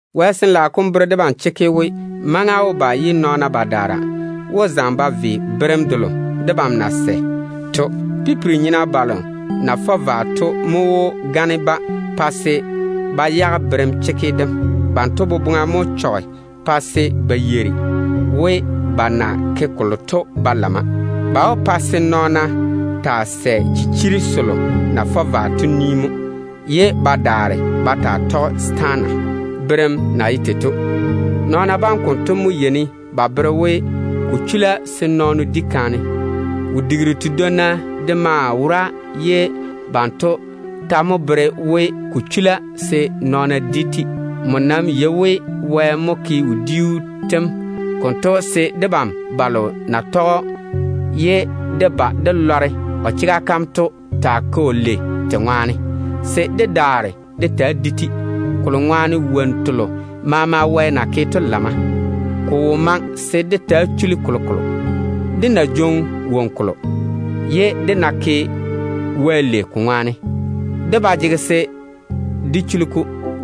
Wɛ Sin-laao kom bere debam chekke we, maŋa wó ba ye nɔɔna badaara wó zaŋe ba ve berem delo debam na sɛ to. Pipiri-nyena balo na fɔ vwa to mo wó gane-ba, pa se ba yage berem chekke dem. Banto boboŋa mo chɔge pa se ba yeiri we ba na ke kolo to ba lamma. Ba wó pa se nɔɔna taa sɛ chichiri selo na fɔ vwa to ni mo, ye ba tɔge setaana bera yam na ye tei to. Nɔɔna bam konto mo yeini ba bere we, ko chula se nɔɔno di kaane. Wodiiru tedwonna de maa wora ye banto ta bere we, ko chula se nɔɔna taa di-te. Nmo nam yei we, Wɛ mo ke wodiiru tem konto se debam balo na tɔge‑o ye dé ba dé lɔre o chega kam to taa ke‑o lei te ŋwaane, se dé daare dé taa di-te. Kolo ŋwaane wonnu telo maama Wɛ na naane to lamma. Ko wo maŋe se dé taa chuli kolokolo dim. Dé ná jwoŋi woŋo kolo, ye dé ná ke Wɛ lei ko ŋwaane, dé ba jege se dé chuli ko dim.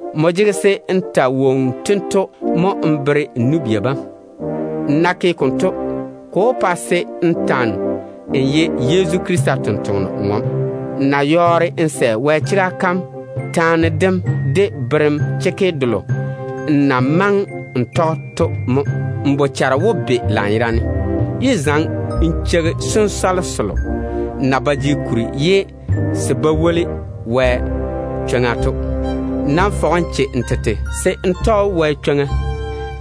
Nmo jege se n ta wonnu tento mo n bere n nu-bia bam. N ná ke konto, ko wó pa se n ta‑n ye Yezu Krista tontoŋeno-ŋom. N ná yɔɔre n sɛ Wɛ chega kam de berem chekke delo n na maŋe n tɔge to mo, n bochare wó be lanyerane. Yé zaŋe n cheigi sensɔle selo na ba jege kuri ye se ba woli Wɛ chwoŋa to. Nam fɔge n che n tete se n ta‑n tɔge Wɛ chwoŋa chekke.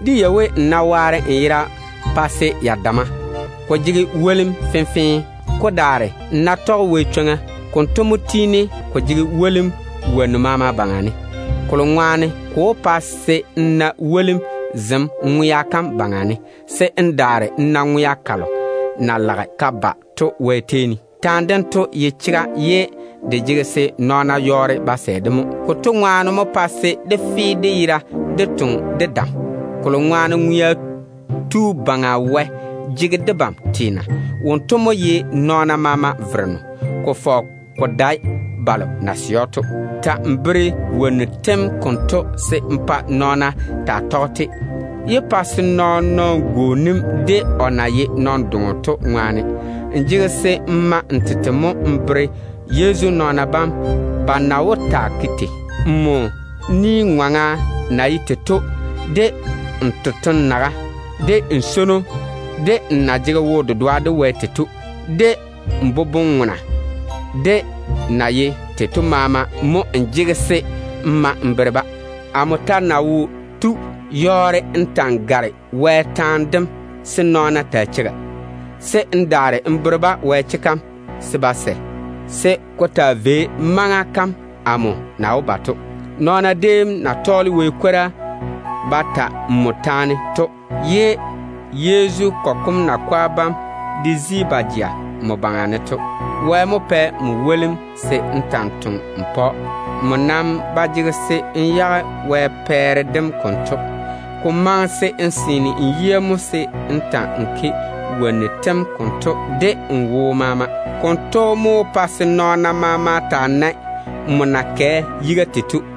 Dé yei we, n ná waare n yera pa se ya damma, ko jege wolim fenfee. Ko daare, n ná tɔge Wɛ chwoŋa, konto mo tiini ko jege wolim wonnu maama baŋa ne. Kolo ŋwaane ko wó pa se n na wolim zem ŋwea kam baŋa ne, se n daare n na ŋwea kalo na lage ka ba to Wɛ tei ne. Taane dem konto ye chega ye de jege se nɔɔna yɔɔre ba sɛ-de mo. Konto ŋwaane mo pae se dé fe dé yera dé toŋe de dam, kolo ŋwaane Ŋwea Tu Baŋa Wɛ jege debam teena. Wonto mo ye nɔɔna maama Vereno, ko fɔge ko dae balo na sɛ‑o de wo-dedoa to. Ta‑n bere wonnu tem konto se n pa nɔɔna taa tɔge-te. Yé pa se nɔɔn-nɔɔno gwooni‑m, n na ye nɔn-doŋo to ŋwaane. N jege se n ma n tete mo n bere Yezu nɔɔna bam ba na wó taa ke tei. Nmo ni-ŋɔŋa na ye tei to, de n totoŋ-naga, de n swono, de n na jege wo-dedoa de Wɛ tei to, de n boboŋ-dɛɛra de na ye tei to maama mo n jege se n ma n bere-ba. Amo ta ná wo tu, yɔɔre n ta‑n gare Wɛ tɔnɔ kom se nɔɔna taa cheiga, se n daare n bere-ba Wɛ chega kam se ba sɛ. Maŋa kalo nɔɔna déem na pworisi nmo ŋwaane, ye Yezu kɔgɔ kom nakwa bam de daŋe ba je nmo baŋa ne to, Wɛ mo pɛ‑m wolim se n ta‑n toŋe n pa‑o. Nmo nam ba jege se n dole n yage Wɛ pɛɛre dem konto. Ko maŋe se n seene n yia mo se n ta‑n ke wonnu tem konto de n wo maama. Konto mo wó pa se nɔɔna maama taa nae nmo na kɛ yiga tei to.